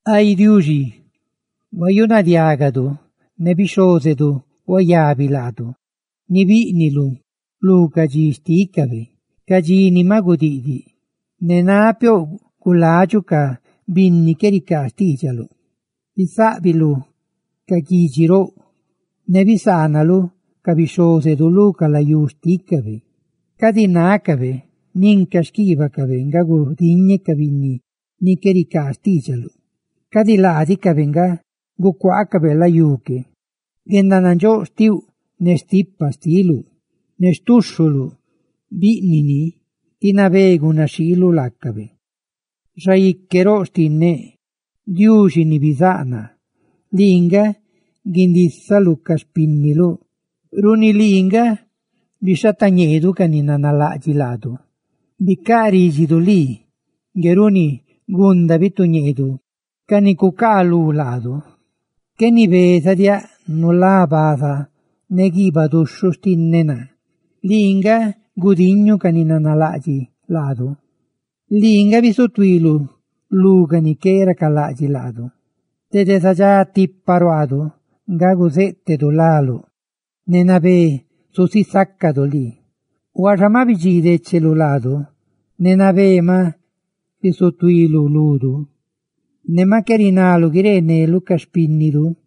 Ay Diuxi, ne diágadu huayunadiágadu, ne bixhózedu huayabi laadu ni bíꞌniluꞌ lu ca dxi xtícabe, ca dxi ni maꞌ gudiꞌdiꞌ, ne nápiouꞌ guladxuꞌ ca binni qué ricaa xtiidxaluꞌ, bisáꞌbiluꞌ ca guidxi roꞌ, ne bisaanaluꞌ ca bixhózedu lu ca layú xtícabe. Cadi nádiꞌcabe nin ca xquiibacabe nga gudiñe ca binni ni qué ricaa xtiidxaluꞌ; cadi laadicabe nga gucuaacabe layú que. ¡Guendanandxóꞌ xtiuꞌ, ne stipa xtiluꞌ! ¡Ne xtuxhuluꞌ, biꞌnuꞌ ni ti nabé gunaxhiiluꞌ laacabe! ¡Xaique roꞌ xtinneꞌ! ¡Diuxi ni bizáꞌ naa! lii nga gundísaluꞌ ca xpínniluꞌ; runi lii nga bixhatañeedu ca ni nanalaꞌdxiꞌ laadu; ¡bicaꞌ rídxiduꞌ lii ngue runi gunda bituñeedu ca ni cucaalú laadu! Qué nibezadiáꞌ nulá baza, ne guiibaꞌ duxhuꞌ xtinneꞌ naa; lii nga gudiñuꞌ ca ni nanalaꞌdxiꞌ laadu, lii nga bisutuiluꞌ lú ca ni qué racalaꞌdxiꞌ laadu. ¡Ay Diuxi, dede zadxá tipa ruaaduꞌ nga guzéꞌtedu láluꞌ, ne nabé zusisácadu lii! Huaxa maꞌ bidxiidecheluꞌ laadu; ne nabé maꞌ bizutuiluꞌ ludu. Ne maꞌ qué rinaluꞌ guireeneluꞌ ca xpínniduꞌ.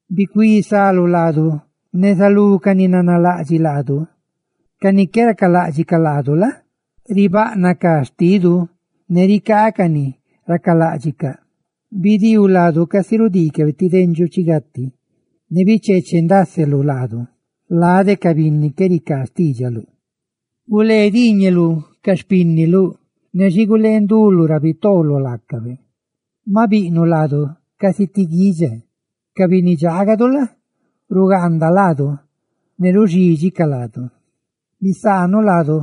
Bicuí salu laadu neza lú ca ni nanalaꞌdxiꞌ laadu; ca ni qué racaláꞌdxicaꞌ laadu la? ribaꞌnaꞌ ca xtidu, ne ricaacaꞌ ni racaláꞌdxicaꞌ. Bidiiu laadu sica rudiicabe ti dendxuꞌ chi gati; ne bicheechendaseluꞌ laadu lade ca binni qué ricaa xtiidxaluꞌ; gulee diiñeluꞌ ca xpínniluꞌ, ne xi gulee nduluꞌ ra bitooloꞌ laacabe. Maꞌ biꞌnuꞌ laadu casi ti guidxa; ca binni dxaagadu la? rugaandacaꞌ laadu ne ruxídxicaꞌ laadu. Bisaanuꞌ laadu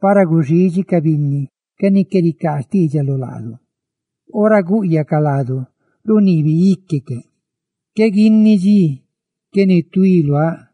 para guxidxi ca binni ca ni qué ricaa xtiidxaluꞌ laadu; ora gúꞌyacaꞌ laadu, runiibi íquecaꞌ. Qué guini dxi qué nituí luáꞌ;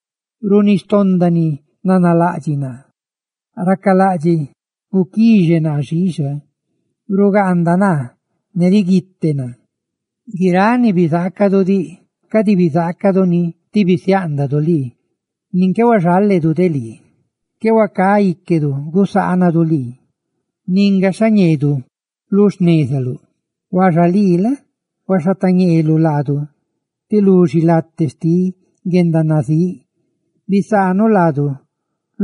runi xtonda ni nanalaꞌdxiꞌ naa, racalaꞌdxiꞌ guquixe naa xiixa, rugaanda naa, ne riguite naa. Guiráꞌ ni bizaacaduꞌ diꞌ cadi bizaacadu ni ti bisiáꞌndaduꞌ lii. ¡Nin qué huaxaledu de lii! Qué huacá íquedu gusaanadu lii nin gaxha ñeedu lu xnezaluꞌ. Huaxa lii la? huaxhateñeeluꞌ laadu lu xilate xtiꞌ guendanazíꞌ. ¡Bisaanuꞌ laadu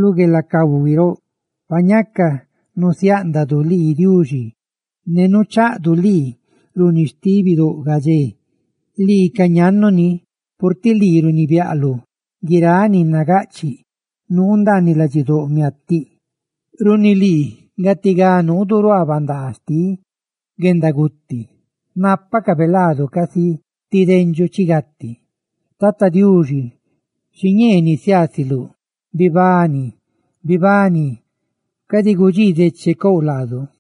lu gueelacahui roꞌ! Ay Diuxi, pa ñaca nusiáꞌndadu lii, ne nuchaꞌdu lii runi xti bidóꞌ gadxé, lii ca ñannu ni, purtiꞌ lii runibiaꞌluꞌ guiráꞌ ni nagaꞌchiꞌ nuu ndaaniꞌ ladxidóꞌ miatiꞌ. Runi lii gatigá nuudu ruaa bandaa xtiꞌ guendaguti; nápacabe laadu casi ti dendxuꞌ chi gati. Tata Diuxi, xiñee nisiaasiluꞌ. ¡Bibani, bibani! ¡Cadi gudxii dechecouꞌ laadu!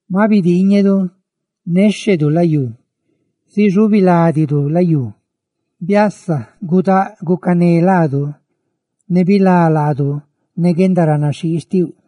Maꞌ bidiiñedu, néxhedu layú, zixubi ládidu layú. ¡Biasa, gudáꞌ gacaneuꞌ laadu, ne bilá laadu ne guendaranaxhii xtiuꞌ!